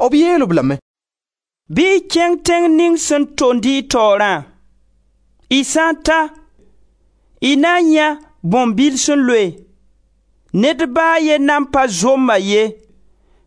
B yeel-b lame: «Bɩ y kẽng tẽng ning sẽn tond y taoorã; y sã n ta, y na n yãe bõn-bil sẽn loe; ned ba a ye nan pa zomb-a ye.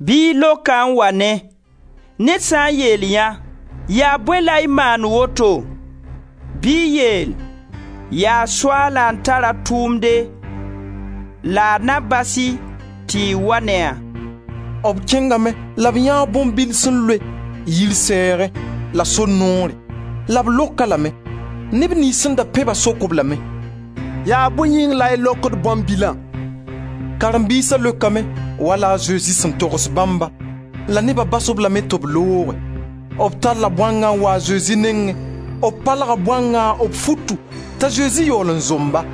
Bɩ y lok-a n wa ne. Ned sã n yeel yã: ‹Yaa bõe la y maand woto?› bɩ y yeel: ‹Yaa Soaala n tar a tʋʋmde, la a na bas-y tɩ y wa ne a.›» B kẽngame la b yãee bõn-bil sẽn loe, yir sɛɛgẽ la sor noore, la b lok-a lame. Neb niyns sẽn da pẽ-ba sok-b lame: «Yaa bõe yĩng la y lokd bõn-bilã?» Karen-biisa leokame wala a Zezi sẽn togs bãmbã la neba bas-b lame tɩ b looge. B talla bõangã n wa a Zezi nengẽ, b palga bõangã b futu, t'a Zezi yaool n zomb-a.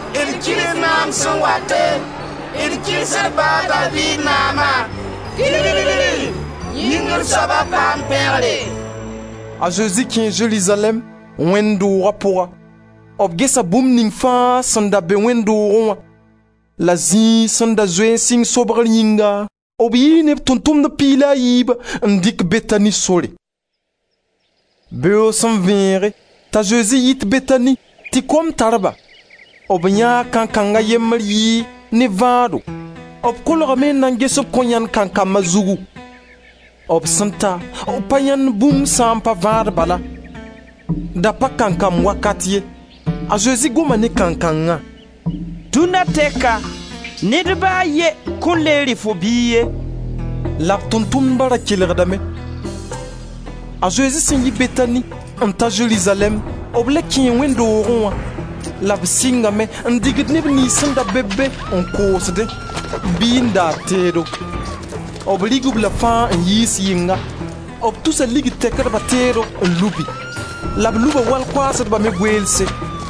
D kils naam sẽn wate, d kils d ba a Daviid Naama! Kilill, Yĩngr soaba paam pẽgre!» A Zezi kẽe Zerizalɛɛm, wẽnd dooga pʋga, b gesa bũmb ning fãa sẽn da be wẽnd doogẽ wã, la zĩig sẽn da zoe n sɩng sobgr yĩnga, b yii ne b Tʋʋm-tʋmdb piig la a yiibã n dɩk Betani sore. Beoog sẽn vẽege, t'a Zezi yit Betani, tɩ kom tar-ba, b yãee kankang a yembr yɩɩg ne vãado; b kolgame n na n ges b kõn yãend kankam a zugu. B sẽn ta, b pa yãend bũmb sã n pa vãad bala. Da pa kankam wakat ye. A Zezi goma ne kankangã: «Dũnna tɛka ned ba a ye kõn le rɩ fo biig ye.» La b Tʋʋm-tʋmdba ra kelgdame. A Zezi sẽn yi Betani n ta Zerizalɛɛm, b le kẽe wẽnd doogẽ wã, la b sɩngame n digd neb niyns sẽn da be-b be n koosdẽ bɩ n daad teedo. B rɩg-b-la fãa n yiis yɩnga. B tusa ligd tɛkdba teedo n lubi, la b luba wal-koaasdba me goeelse.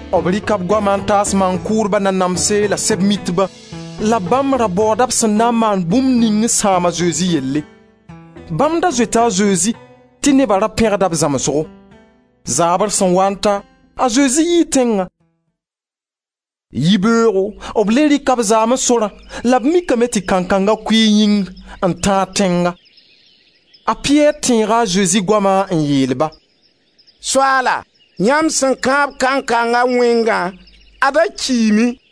B rɩka b goama n taas maan-kʋʋdba nanamse la Sɛb-mitba la bãmb ra baooda b sẽn na n maan bũmb ning n sãam a Zezi yelle. Bãmb da zoeta a Zezi tɩ neba ra pẽgda b zãmsgo. Zaabr sẽn waa n ta, a Zezi yii tẽngã. Yibeoogo b le rɩka b zaamẽ sorã la b mikame tɩ kankanga kʋɩɩ yĩngr n tãag tẽnga. A Piyɛr tẽega a Zezi goama n yeel-ba: «Soaala, yãmb sẽn kãab kankanga wẽngã, ad-a kiime!»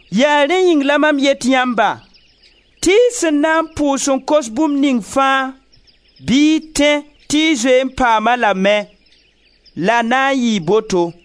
Yaa rẽ yĩng la mam yet yãmba tɩ y sẽn na n pʋʋs n kos bũmb ning fãa, bɩ y tẽ tɩ y zoe n paam-a lame, la na n yɩɩ boto.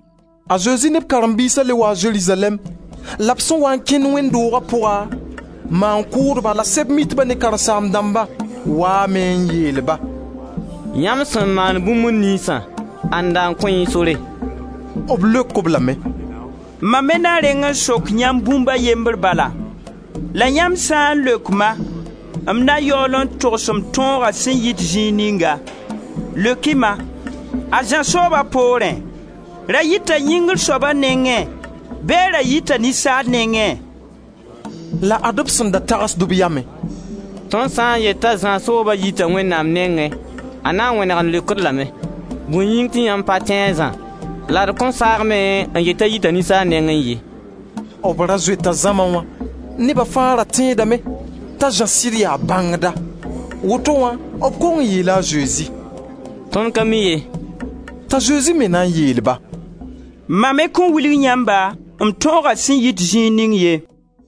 A Zezi ne b karen-biisa le waa Zerizalɛɛm la b sẽn waa n kẽnd wẽnd dooga pʋga, maan-kʋʋdba la Sɛb-mitba ne karen-saam-dãmba waame n yeel-ba: «Yãmb sẽn maand bũmb niynsã, ãnda n kõ y sore?» B leok-b lame: «Ma me na reng n sok yãmb bũmb a yembre bala, la yãmb sã n leok-ma, m na yaool n togs m tõoga sẽn yit zĩig ninga. Leok-y-ma, a Zã sooba poorẽ, ra yita Yĩngri Soaba nengẽ bɩ a ra yita ninsaal nengẽ?» La ad-b sẽn da tagsd b yamẽ: «Tõnd sã n yet t'a Zã sooba yita Wẽnnaam nengẽ, a na n wẽneg n leok-d lame: ‹Bõe yĩng tɩ yãmb pa tẽ a Zã?› La d kõn saag me n yeel t'a yita ninsaal nengẽ ye.» B ra zoeta zãma wã. Neba fãa da tẽedame t'a Zã sɩd yaa bãngda. Woto wã, b kong n yeela a Zezi: «Tõnd ka mi ye.» T'a Zezi me na n yeel-ba: «Ma me kõn wilg yãmba m tõoga sẽn yit zĩig ning ye.»